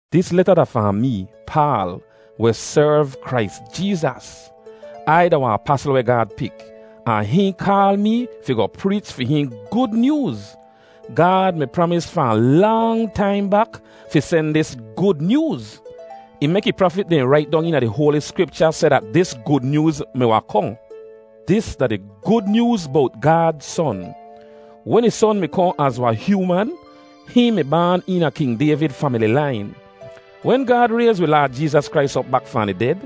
Dis leta da fahn mee, Paal, weh serv Krais Jeezas. Ai da wahn apasl weh Gaad pik, ahn hihn kaal mee fi goh preech fi hihn Gud Nyooz. Gaad mi pramis fahn lang taim bak fi sen dis Gud Nyooz. Ih mek ih prafit dehn rait dong eena di hoali Skripcha seh dat dis Gud Nyooz mi wahn kohn. Dis da di Gud Nyooz bowt Gaad Son. Wen ih Son mi kohn az wahn hyooman, hihn mi baan eena King Dayvid famili lain. Wen Gaad rayz wi Laad Jeezas Krais op bak fahn di ded,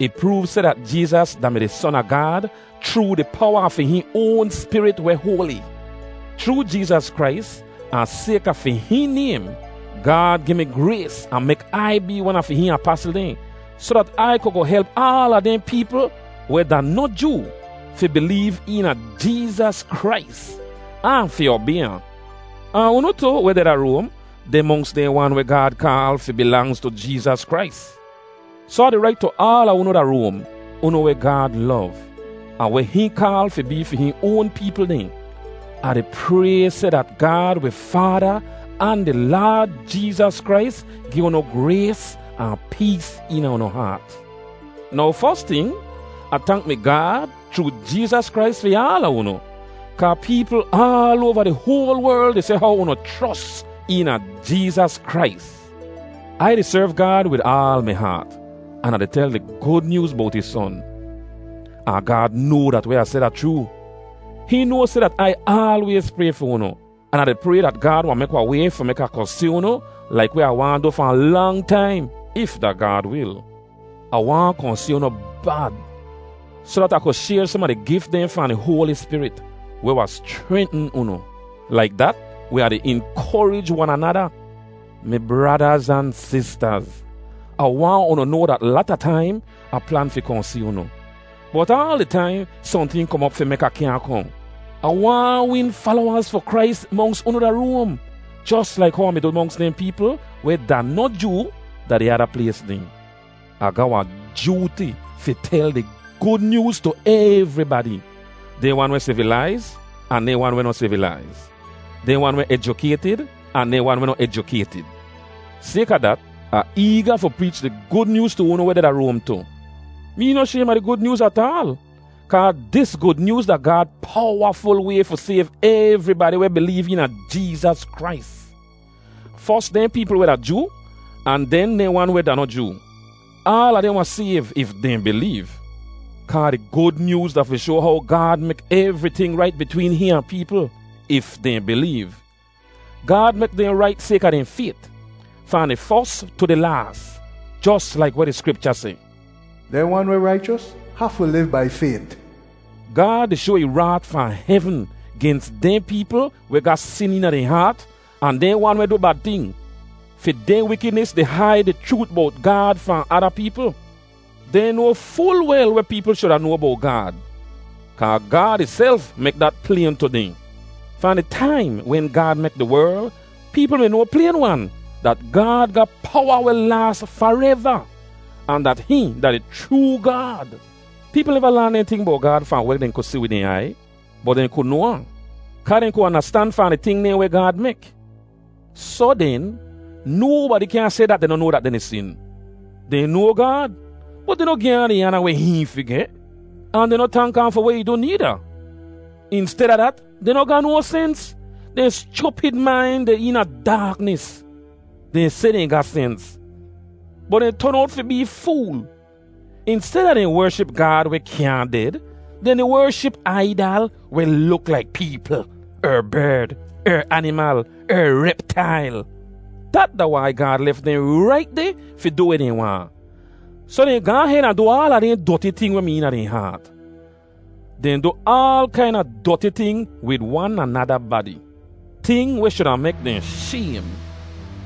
ih proov seh dat Jeezas da-mi di Son a Gaad chroo di powa a fi hihn oan Spirit weh hoali. Chroo Jeezas Krais, ahn sayka fi hihn naym, Gaad gi mi grays ahn mek Ai bee wan a fi hihn apasl dehn, soh dat Ai ku goh help aala dehn peepl weh da noh Joo fi bileev eena Jeezas Krais, ahn fi obay ahn. Ahn unu tu, weh deh da Roam, deh monks dehn wan weh Gaad kaal fi bilangz tu Jeezas Krais. Soh Ah di rait tu aala unu da Roam, unu weh Gaad lov, ahn weh hihn kaal fi bee fi hihn oan peepl dehn. Ah di pray seh dat Gaad wi Faada ahn di Laad Jeezas Krais gi unu grays ahn pees eena unu haat. Now fos ting, Ah tank mi Gaad chroo Jeezas Krais fi aala unu, kaa peepl aal oava di hoal werl di seh how unu chros eena Jeezas Krais. Ai di serv Gaad wid aal mi haat an Ah di tel di Gud Nyooz bowt ih Son, ahn Gaad noa dat weh Ah seh da chroo. Hihn noa seh dat Ai aalwayz pray fi unu. An Ah di pray dat Gaad wahn mek wahn way fi mek Ah kohn si unu laik weh Ah waahn du fahn lang taim, if da Gaad wil. Ah waahn kohn si unu bad, soh dat Ah ku shayr som a di gif dehn fahn di Hoali Spirit, weh wahn schrentn unu. Laik dat, wi wahn di inkorij wan anada. Mi bradaz ahn sistaz, Ah waahn unu noa dat lata taim Ah plan fi kohn si unu, bot aal di taim sohnting kom op fi mek Ah kyaahn kohn. Ah waahn win falowaz fi Krais monks unu da Roam, jos laik how Ah mi du monks dehn peepl weh da noh Joo da di ada plays dehn. Ah ga wahn jooti fi tel di Gud Nyooz tu evribadi: dehn wan weh sivilaiz, ahn dehn wan weh noh sivilaiz, dehn wan weh ejukaytid, ahn dehn wan weh noh ejukaytid. Sayka dat, Ah eega fi preech di Gud Nyooz tu unu weh deh da Roam tu. Mee noh shaym a di Gud Nyooz ataal, kaa dis Gud Nyooz da Gaad powaful way fi sayv evribadi weh bileev eena Jeezas Krais, fos dehn peepl weh da Joo, ahn den dehn wan weh da noh Joo. Aala dehn wahn sayv if dehn bileev. Kaa di Gud Nyooz da fi shoa how Gaad mek evriting rait bitween hihn ahn peepl, if dehn bileev. Gaad mek dehn rait sayka dehn fayt, fahn di fos tu di laas, jos laik weh di Skripcha seh, “Dehn wan weh raichos hafu liv bai fayt.” Gaad di shoa ih raat fahn hevn gens dehn peepl weh ga sin eena dehn haat ahn dehn wan weh du bad ting. Fi dehn wikidnis di haid di chroot bowt Gaad fahn ada peepl. Dehn noa ful wel weh peepl shuda noa bowt Gaad kaa Gaad ihself mek dat playn tu dehn. Fahn di taim wen Gaad mek di werl, peepl mi noa playn-wan dat Gaad ga powa weh laas fareva, ahn dat hihn da di chroo Gaad. Peepl neva laan dehn ting bowt Gaad fahn weh dehn ku si wid dehn aiy, bot dehn ku noa ahn, kaa dehn ku andastan fahn di ting dehn weh Gaad mek. Soh den, nobadi kyaahn seh dat dehn noh noa dat dehn di sin. Dehn noa Gaad, bot dehn noh gi ahn di aana weh hihn fi geh. Ahn dehn noh tank ahn fi weh ih du needa. Insteda dat, dehn noh ga no sens. Dehn schupid main deh eena daaknis. Dehn seh dehn ga sens, bot dehn ton owt fi bee fool. Insteda dehn wership Gaad weh kyaahn ded, dehn di wership aidal weh luk laik peepl, er berd, er animal, er reptail. Dat da wai Gaad lef dehn rait deh fi du weh dehn waahn, soh dehn gaahn hed ahn du aala dehn doti ting weh mi eena dehn haat. Dehn du aal kaina doti ting wid wan anada badi, ting weh shuda mek dehn shaym.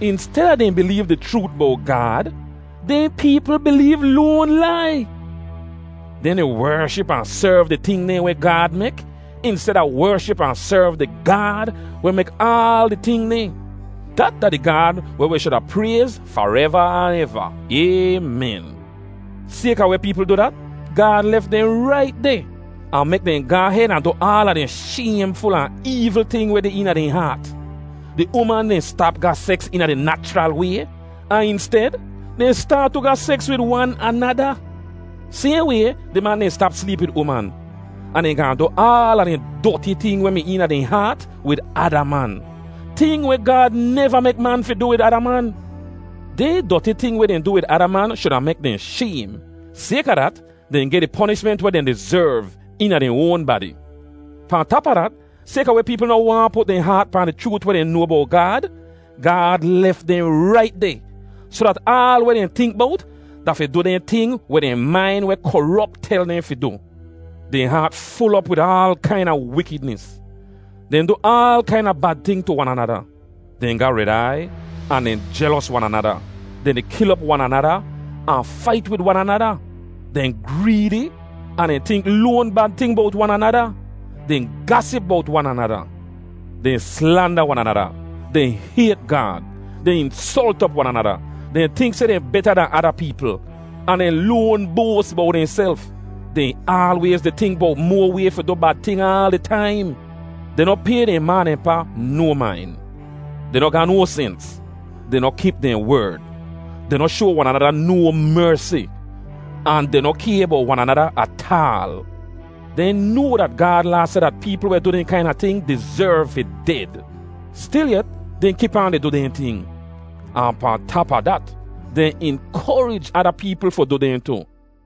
Insteda dehn bileev di chroot bowt Gaad, dehn peepl bileev loan lai. Dehn di wership ahn serv di ting dehn weh Gaad mek insteda wership ahn serv di Gaad weh mek aal di ting dehn. Dat da di Gaad weh wi shuda prayz fareva ahn eva. Aymen. Sayka weh peepl du dat, Gaad lef dehn rait deh, ahn mek dehn gaahn hed ahn du aala dehn shaymful ahn eevl ting weh deh eena dehn haat. Di uman dehn stap ga seks eena di nachral way, ahn insted, dehn staat tu ga seks wid wan anada. Sayhn way, di man dehn stap sleep wid uman, ahn dehn gaahn du aala dehn doti ting weh mi eena dehn haat wid ada man, ting weh Gaad neva mek man fi du wid ada man. Dehn doti ting weh dehn du wid ada man shuda mek dehn shaym. Sayka dat, dehn geh di ponishment weh dehn dizerv, eena dehn oan badi. Pahn tap a dat, sayka weh peepl noh waahn put dehn haat pahn di chroot weh dehn noa bowt Gaad, Gaad lef dehn rait deh, soh dat aal weh dehn tink bowt, da fi du dehn ting weh dehn main weh korop tel dehn fi du. Dehn haat ful op wid aal kaina wikidnis. Dehn du aal kaina bad ting tu wan anada. Dehn ga red aiy, ahn dehn jelos wan anada; dehn di kil op wan anada, ahn fait wid wan anada; dehn greedi, ahn dehn tink loan bad ting bowt wan anada; dehn gasip bowt wan anada. Dehn slanda wan anada; dehn hayt Gaad; dehn insolt op wan anada; dehn tink seh dehn beta dan ada peepl, ahn dehn loan boas bowt dehnself; dehn aalwayz di tink bowt moa way fi du bad ting aal di taim; dehn noh pay dehn ma ahn dehn pa no main. Dehn noh ga no sens; dehn noh kip dehn werd. Dehn noh shoa wan anada no mersi, ahn dehn noh kay bowt wan anada ataal. Dehn noa dat Gaad Laa seh dat peepl weh du dehn kaina ting dizerv fi ded. Stilyet, dehn kip aan di du dehn ting, ahn pahn tap a dat, dehn inkorij ada peepl fi du dehn tu.